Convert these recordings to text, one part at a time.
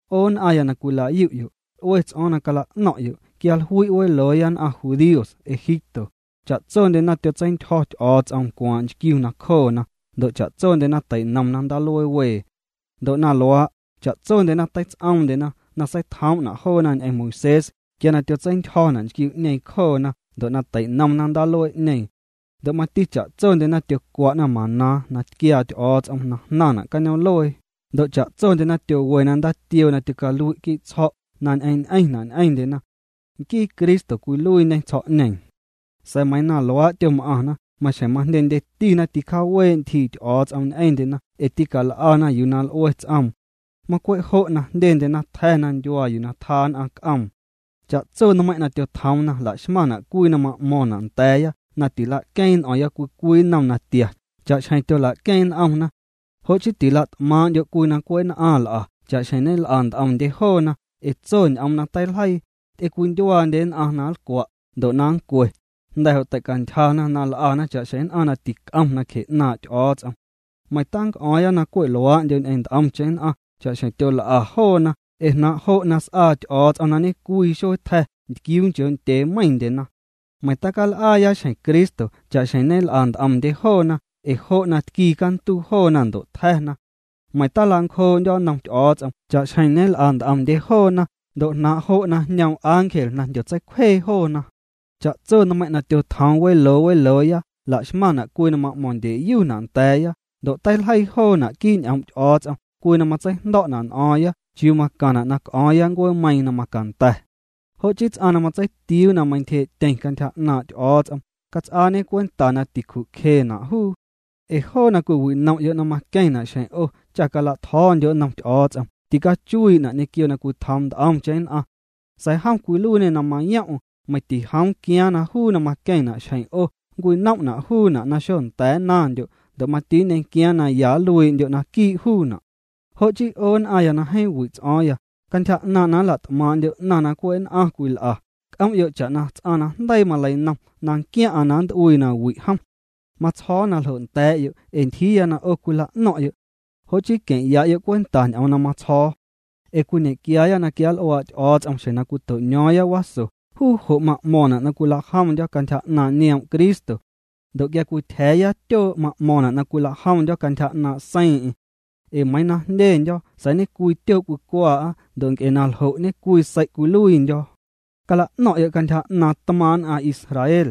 'O nn'aⁿya na cwila'yu'yo', l'ue ts'o̱o̱ⁿ na cala'no̱ⁿ'yo' quia jlui' welooya nn'aⁿ judíos Egipto, cha'tsondyena tyotseintyjo̱ Ty'o̱o̱ts'om ncwaaⁿ' nchquiu nacjoona ndo' cha'tsondyena teinomna Ndaaluee Wee. Ndo' na luaa', cha'tsondyena teits'oomndyena na seitjoom'na' joona ñ'eⁿ Moisés quia na tyotseintyjo̱na' nchquiu'ñeeⁿ cjoona ndo' na teinomna ndaaluee'ñeeⁿ. Ndo' mati cha'tsondyena tyocwa'na maná na tquiaa Ty'o̱o̱ts'om na jnaⁿna' cañoom'luee, ndo' cha'tsondyena tyowena ndaatioo na tyocalui'na' quii' tsjo̱' na ñ'eⁿ ñ'eⁿna' ñ'eⁿndyena. Nquii Cristo cwiluiiñe tsjo̱'ñeeⁿ. Sa̱a̱ meiiⁿ na luaa' tyom'aⁿna, maxjeⁿ majndyendyetina ticjaawee' ntyjii Ty'o̱o̱ts'om ñ'eⁿndyena ee tîcal'ana yuu na l'ue ts'oom. Macwe' jo' jndyendyena tja̱na ndyuaa yuu tja nn'aⁿ c'oom. Cha'tso nmeiⁿ' na tyotjoomna laxmaⁿna' cwii na ma'mo̱ⁿna' nda̱a̱ya na tila'queeⁿ n'o̱o̱ⁿya cwii cwii nnom natia cha'xjeⁿ tyola'queeⁿ n'omna. Jo' chii tila't'maaⁿ'ndyo' cwii na cwe' nn'aⁿ l'a cha'xjeⁿ ñel'a nt'omndye joona ee tso ñ'oom na teiljeii: “Ty'ewindyuaandye nn'aⁿ na nlcwa' ndo' na nncwe, jnda̱ jo' teicantyjana na l'ana cha'xjeⁿ nn'aⁿ na tic'om nacje 'naaⁿ' Ty'o̱o̱ts'om.” Meiⁿ tanc'o̱o̱ⁿya na cwe' luaa'ndyo ñ'eⁿ nt'omcheⁿ nn'aⁿ cha'xjeⁿ na tyol'a joona ee jnaaⁿ' jo' na s'aa Ty'o̱o̱ts'om na ñecwii xuee tja̱ ntquiuu nchoo' ndyee meiⁿndyena. Meiⁿ tacal'aaya xjeⁿ Cristo cha'xjeⁿ ñel'a nt'omndye joona, ee jo' na tquii canduu joona ndo' tja̱na. Meiⁿ tilancjoo'ndyo' nnom Ty'o̱o̱ts'om cha'xjeⁿ ñel'a nt'omndye joona, ndo' jnaaⁿ' jo' na jñoom ángel na jndyotseicwjee joona. Cha'tso nmeiⁿ' na tyotjoom weloo welooya, laxmaⁿna' cwii na ma'mo̱ⁿndyeyuna' nda̱a̱ya, ndo' teiljeii joona' quii' ñ'oom' Ty'o̱o̱ts'om cwii na matseijndo̱'na' n'o̱o̱ⁿya chiuu macaⁿna' na c'o̱o̱ⁿya ncueemeiiⁿ na macanda̱. Jo' chii ts'aⁿ na matseitiuu na meintyjee'tyeⁿ cantyja 'naaⁿ' Ty'o̱o̱ts'om, cats'aañe cwenta na ticju'cjena' juu. Ee joo na cwiwinom'yo' na maqueⁿna' xjeⁿ 'o cha cala'tjo̱o̱ndyo' nnom Ty'o̱o̱ts'om, ticachuii'na' ñequio na cwitjoom nt'omcheⁿ nn'aⁿ. Sa̱a̱ jom cwiluiiñê na mayoom'm, meiⁿ tijoom quiaaⁿ na juu na maqueⁿna' xjeⁿ 'o nncwinom'na' juuna' na xocanda̱a̱ nnaⁿndyo' ndo' mati nñequiaaⁿ na ya nluii'ndyo' naquii' juuna'. Jo' chii 'o nn'aⁿya na jeeⁿ wi' ts'o̱o̱ⁿya, cantyja 'naaⁿ' na nla't'maaⁿ'ndyo' 'naⁿ na cwe' nn'aⁿ cwil'a, c'om'yo' cha'na ts'aⁿ na jndeii maleinom na nquiaⁿ'aⁿ na nnt'uii nawi' jom. Matsjo̱o̱ na ljo' nda̱a̱'yo' ee ntyjiiya na 'o cwila'no̱ⁿ'yo'. Jo' chii queⁿya'yo' cwenta ñ'oom na matsjo̱o̱. Ee cwiñequiaaya na quianl'uaa' Ty'o̱o̱ts'om xjeⁿ na cwito'ño̱o̱ⁿya waso, juu jo' ma'mo̱ⁿna' na cwilajomndyo̱ cantyja 'naaⁿ' nioom' Cristo. Ndo' quia cwityja̱a̱ya tyoo' ma'mo̱ⁿna' na cwilajomndyo̱ cantyja 'naaⁿ' seiiⁿ'eⁿ. Ee meiiⁿ na jndyendyo̱ sa̱a̱ ñe'cwii tyoo' cwicwaa'a ndo' nc'e na ljo' ñe'cwii sei' cwiluiindyo̱. Cala'no̱ⁿ'yo' cantyja 'naaⁿ' tmaaⁿ' nn'aⁿ Israel.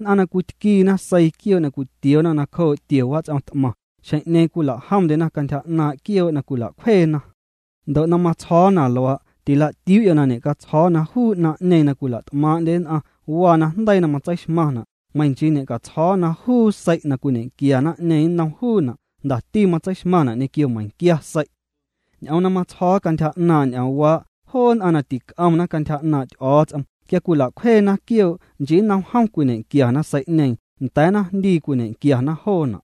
Nn'aⁿ na cwitquiina seii quioo' na cwitioona nacjoo' tio wats'om t'maⁿ, xjeⁿ'ñeeⁿ cwilajomndyena cantyja 'naaⁿ' quioo' na cwila'cwjeena. Ndo' na matsjo̱o̱ na luaa', tila'tiuu'yo' na ñe'catsjo̱o̱ na juu 'naⁿ'ñeeⁿ na cwila't'maaⁿ'ndye nn'aⁿ waa najndeii na matseixmaⁿna' meiⁿ nchii na ñe'catsjo̱o̱ na juu sei' na cwiñequia naⁿ'ñeeⁿ nnom juuna' jndati matseixmaⁿna' ñequio meiⁿquia sei'. Ñ'oom na matsjo̱o̱ cantyja 'naaⁿ' ñ'oomwaa', joo nn'aⁿ na tic'omna cantyja 'naaⁿ' Ty'o̱o̱ts'om, quia cwila'cjweena quioo', nchii nnom jom cwiñequiana sei'ñeeⁿ, nda̱a̱ naⁿjndii cwiñequiana joona'.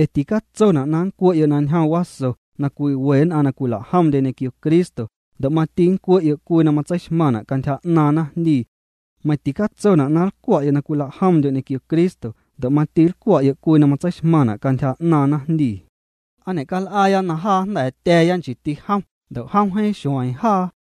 Ee ticatsona' na nncwe'yo' na njom waso na cwiwe nn'aⁿ na cwila'jomndye ñequio Cristo, ndo' mati nncwe'yo' cwii na matseixmaⁿna' cantyja 'naaⁿ naⁿjndii. Meiⁿ ticatsona' na nlcwa'yo' na cwila'jomndyo' ñequio Cristo, ndo' mati nlcwa'yo' cwii na matseixmaⁿna' cantyja 'naaⁿ naⁿjndii. ¿Aa ñe'cal'aaya na jaa jnda̱a̱tya̱a̱ya nchiiti jom ndo' jom jeeⁿ xueeⁿ jaa?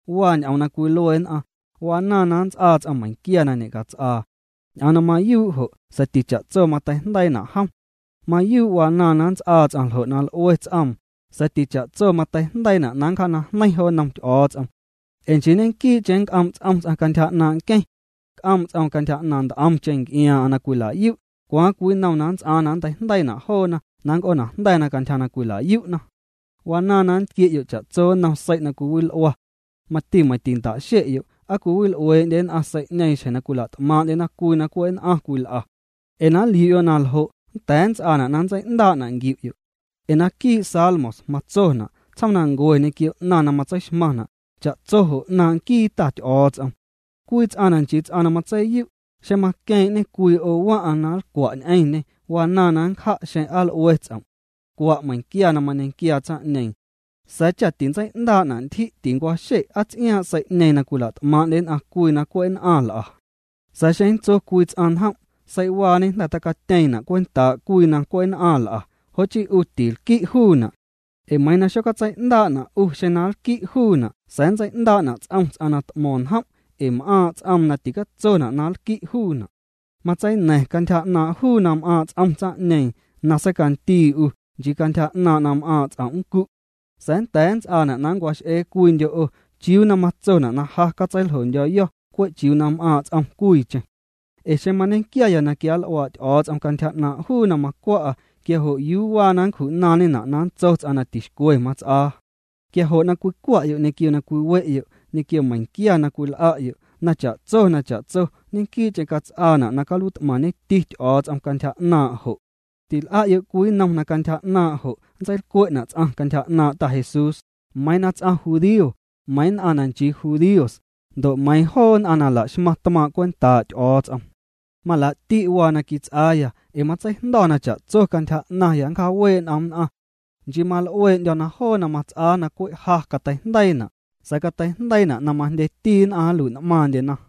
Waa ñ'oom na cwilue nn'aⁿ: “Wanaaⁿ na nnts'aa ts'aⁿ meiⁿquia na ñe'cats'aa.” Ñ'oom na mayuu' jo', sa̱a̱ ticha'tso mateijndeiina' jom. Mayuu' wanaaⁿ na nnts'aa ts'aⁿ ljo' na l'ue ts'oom, sa̱a̱ ticha'tso mateijndeiina' na nncjaanajneiⁿ jo nnom Ty'o̱o̱ts'om. Ee nchii ñequii'cheⁿ nc'oom' ts'om ts'aⁿ cantyja 'naaⁿ' nqueⁿ. C'oom' ts'oom cantyja 'naaⁿ nt'omcheⁿ nc'iaaⁿ'aⁿ na cwila'yu', cwaaⁿ cwii na nnts'aaⁿ na nnteijndeiina' joona na nnc'oonajnda̱na cantyja na cwila'yu'na. Wanaaⁿ na nntquie'yo' cha'tso nnom sei' na cwileil'ua. Meiⁿ tinta'xe'yo' ¿aa cwiwil'uee'ndye nn'aⁿ sei'ñeeⁿ xjeⁿ na cwila't'maaⁿ'ndyena cwii na cwe' nn'aⁿ cwil'a? Ee na nliu'yo' na ljo' nnda̱a̱ nnts'aana' na nntsei'ndaa'na' nquiu'yo'. Ee naquii' Salmos matsona': “Tsjoomnancue ñequio 'naⁿ na matseixmaⁿna', cha'tso jo' 'naaⁿ' nquii Ta Ty'o̱o̱ts'om.” Cwii ts'aⁿ na nchii ts'aⁿ na matseiyu', xeⁿ maqueeⁿ'ñê cwii 'o waⁿ'aⁿ na nlcwa' ñ'eⁿñê, wanaaⁿ na nncja' xeⁿ aa l'ue ts'om'. Cwa' meiⁿquia na mañequiaa tsaⁿ'ñeeⁿ. Sa̱a̱ cha tintsei'ndaa'na' ntyji' tincwaxe' aa ts'iaaⁿ' sei'ñeeⁿ na cwila't'maaⁿ'ndye nn'aⁿ cwii na cwe' nn'aⁿ l'a. Sa̱a̱ xeⁿ nntso cwii ts'aⁿ njom': “Sei'waañe jnda̱ tacatyeeⁿna' cwentaa' cwii na cwe' nn'aⁿ l'a”, jo' chii 'u je' tinlqui' juuna'. Ee meiiⁿ na xocatsei'ndaa'na' 'u xeⁿ na nlqui' juuna' sa̱a̱ nntsei'ndaa'na' ts'om ts'aⁿ na t'mo̱ⁿ njom' ee m'aaⁿ' ts'oom na ticatsona' na nlqui' juuna'. Matseina̱ⁿ cantyja 'naaⁿ' juu na m'aaⁿ' ts'om tsaⁿ'ñeeⁿ na seicandii 'u, nchii cantyja 'naaⁿ' na m'aaⁿ' ts'om' nncu'. Sa̱a̱ nnda̱a̱ nnts'aana' na nncwax'ee cwiindyo' 'o: “¿Chiuu na matsona' na ja catseiljondyo̱yo̱ cwe' chiuu na m'aaⁿ' ts'om cwiicheⁿ? Ee xeⁿ mañequiaya na quianl'uaa' Ty'o̱o̱ts'om cantyja 'naaⁿ' juu na macwa'a, quia jo' ¿yuu waa na nncju'naaⁿñena' na nntso ts'aⁿ na tixcwe mats'aa?” Quia jo' na cwicwa'yo' ñequio na cwiwe'yo', ñequio meiⁿquia na cwil'a'yo', na cha'tso na cha'tso ñequii'cheⁿ cats'aana' na caluiit'maⁿñeti Ty'o̱o̱ts'om cantyja 'naaⁿ' jo'. Til'a'yo' cwii nnom na cantyja 'naaⁿ' jo' nntseilcwe'na' ts'aⁿ cantyja 'naaⁿ' Ta Jesús, meiiⁿ na ts'aⁿ judío, meiiⁿ nn'aⁿ na nchii judíos, ndo' meiiⁿ joo nn'aⁿ na laxmaⁿ tmaaⁿ' cwentaa' Ty'o̱o̱ts'om. Malaa'ti' waa na quits'aaya, ee matseijndo̱ na cha'tso cantyja 'naⁿya nncjaawee' n'om nn'aⁿ. Nchii mal'ueendyo̱ na joo na mats'aa na cwe' ja cateijndeiina', sa̱a̱ cateijndeiina' na majndyeti nn'aⁿ nlui'n'maaⁿndyena.